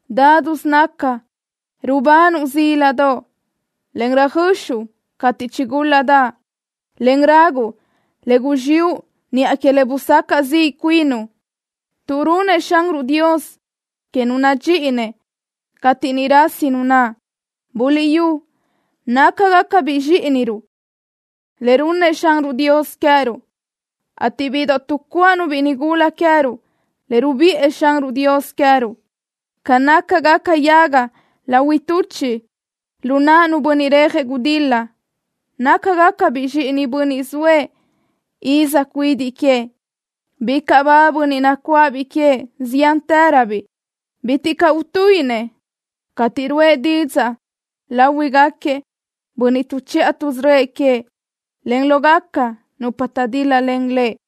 Nítisö naca rubanuʼ zíladoʼ, en röjöxuʼ cateʼ chigúl-ladaʼ, en raguʼ le guzxiʼu niʼa que le busacaʼ ziʼ cuinuʼ, tuʼ runnëʼ Xanruʼ Dios que nu nadxíʼinëʼ cateʼ niʼ rasi nu naʼ. Buliʼyú, nácagacabiʼ zxíʼiniruʼ le runnëʼ Xanruʼ Dios queë́ruʼ, ateʼ bíʼidoʼ tuʼcuáʼanu nigula queë́ruʼ nácagacabiʼ le rubiʼë Xanruʼ Dios queë́ruʼ. Ca nácagaca yaga lahuiʼ tuchiʼ lu naʼ nu bönniʼ rejëʼ gudil-la nácagacabiʼ zxíʼinëʼ bönniʼ zoëʼ iz cuidiʼ queëʼ. Bicaʼ ba bönniʼ nacuáʼabiʼ queëʼ ziántëröbiʼ. Bitiʼ caʼ utuíʼinëʼ cateʼ ruʼë didzaʼ láhuiʼgaquiëʼ bönniʼ tuʼchiʼa tuʼsörö́ëʼ queëʼ, en lógaca nupa taʼdíl-lalen lëʼ.